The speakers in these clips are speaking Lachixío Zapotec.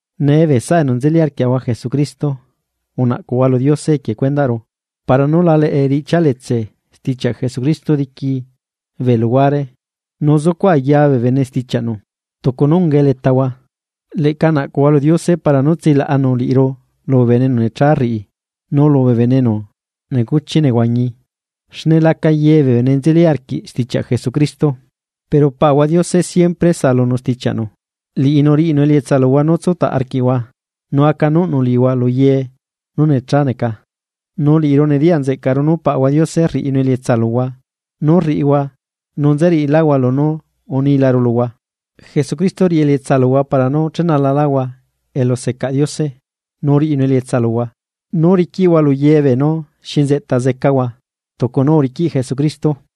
Nee bee saꞌa enu nzeli arquiaꞌahua Jesucristo, unaꞌcuhua lu Diose equie cuendaꞌru para nú la leꞌe riꞌchia letse stichiaꞌ Jesucristo diqui bee luhuare nu zucuꞌ aya bee bene stichiaꞌnu, tucu nú ungae letahua, leꞌca naꞌcuhua lu Diose para nú tsilaꞌanu liꞌiru lu bee bene enu necha rriꞌi, nu lu bee bene enu necuchi nehuañi xne laca ye bee bene nzeli arquiꞌ stichiaꞌ Jesucristo. Pero Paꞌahua Diose siempre saꞌalunu stichiaꞌnu, liꞌinu riꞌinu elietsa luhua nú tsutaꞌ arquiꞌhua, nu acanuꞌnu liꞌihua lu ye nú nechá neca. Nu liꞌiru nediyaꞌ nzeꞌcaꞌru nú Paꞌahua Diose rriꞌinu elietsa luhua nú rriꞌihua nu nzeriꞌiláhua lunú unilaru luhua. Jesucristo riꞌi elietsa luhua para nú chenalahua elu secaꞌ Diose, nu riꞌinu elietsa luhua nú riquiꞌhua lu ye beenú xi nzeꞌta zecahua tucu nú uriquiꞌ Jesucristo.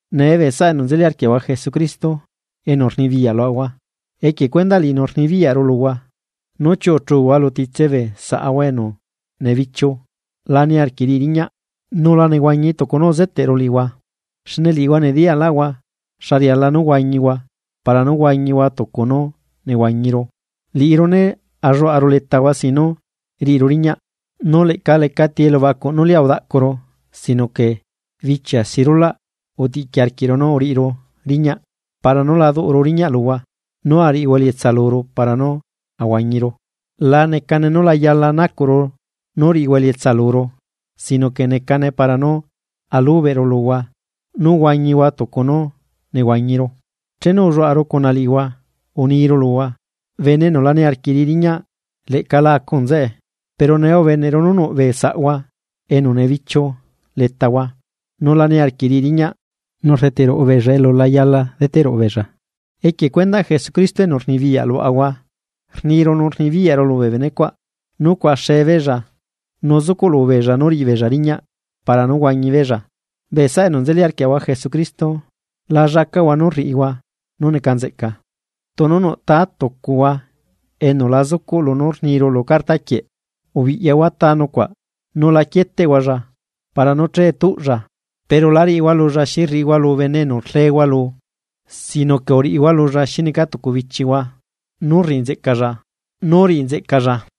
Nee bee saꞌa enu nzeli arquiaꞌahua Jesucristo, enu rnibiyaꞌ luaꞌahua equie cuendaꞌ liꞌinu rnibiyaꞌru luhua nú chiuꞌuchuhua lu titse bee saꞌahua enu nebichiu la niarquiꞌ riꞌi riñaꞌ nu la nehuañi tucu nú uzeteꞌru liꞌihua. Xne liꞌihua nediyaꞌlaꞌhua xa riala nú huañihua para nú huañihua tucu nú nehuañiru. Liꞌiru né alluaꞌaru letahua sin nú riꞌiru riñaꞌ. Nu leꞌca lecati etaꞌ nú lia udaꞌcuru sino que bichia si rulaꞌ utiꞌqui arquiꞌru nu uriꞌiru riñaꞌ para nú la duꞌuru riñaꞌ luhua nú ariꞌihua elietsa luru para nú huañiru, la necane nú la yala nacuꞌru nú riꞌihua elietsa luru sino que necane para nú ulubeꞌru luhua nú huañihua tucu nú nehuañiru. Chenu ulluaꞌaru cuna liꞌihua uniru luhua: bene enu la niarquiꞌ riꞌi riñaꞌ, leꞌca la acu nzeꞌe. Pero nee ubeneꞌru nu nuꞌ bee saꞌhua enu nebichiu letahua nu la niarquiꞌ riꞌi riñaꞌ nu rdeteꞌ ruꞌu beella elu la yala deteꞌ ruꞌu beella. Equie cuendaꞌ Jesucristo enu rnibiyaꞌ luaꞌahua rniru nu rnibiyaꞌru lu bee bene cuaꞌ nú cuaꞌaxe beella nu zucuꞌlu beella nú riꞌi beella riñaꞌ para nú huañi beella. Bee saꞌa enu nzeli arquiaꞌahua Jesucristo, la llacaꞌhua nú rriꞌihua nú neca nzeꞌca. Tunu nuꞌ tá tucuhua enu la zucuꞌ lunú rniru lu carta quieꞌ, ubiꞌyahua ta nucuaꞌ nu la quieteꞌhualla para nú che tuꞌlla. Pero la riꞌihua lulla xi rriꞌihua lu bene enu rlehua lu sino que xi neca tucu bichihua uniꞌhua lulla nú riꞌi nzeꞌcalla.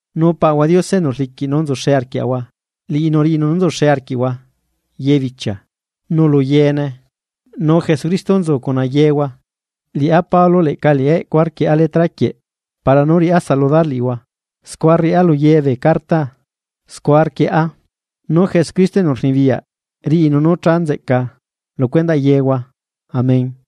Nu Paꞌahua Diose enu rliquiꞌ nú nzuxe arquiaꞌahua, liꞌinu riꞌinu nú nzuxe arquiꞌhua ye bichia nu lu yeene. Nu Jesucristo nzu cuna yeehua. Liꞌá Pablo leꞌca liꞌi eꞌcua rquieꞌa letra quieꞌ para nú riꞌá saludar liꞌihua, scua rriꞌá lu ye bee cartaa, scua rquieꞌa. Nu Jesucristo enu rnibiyaꞌ riꞌinu nú cha nzeꞌca lu cuendaꞌ yehua. Amén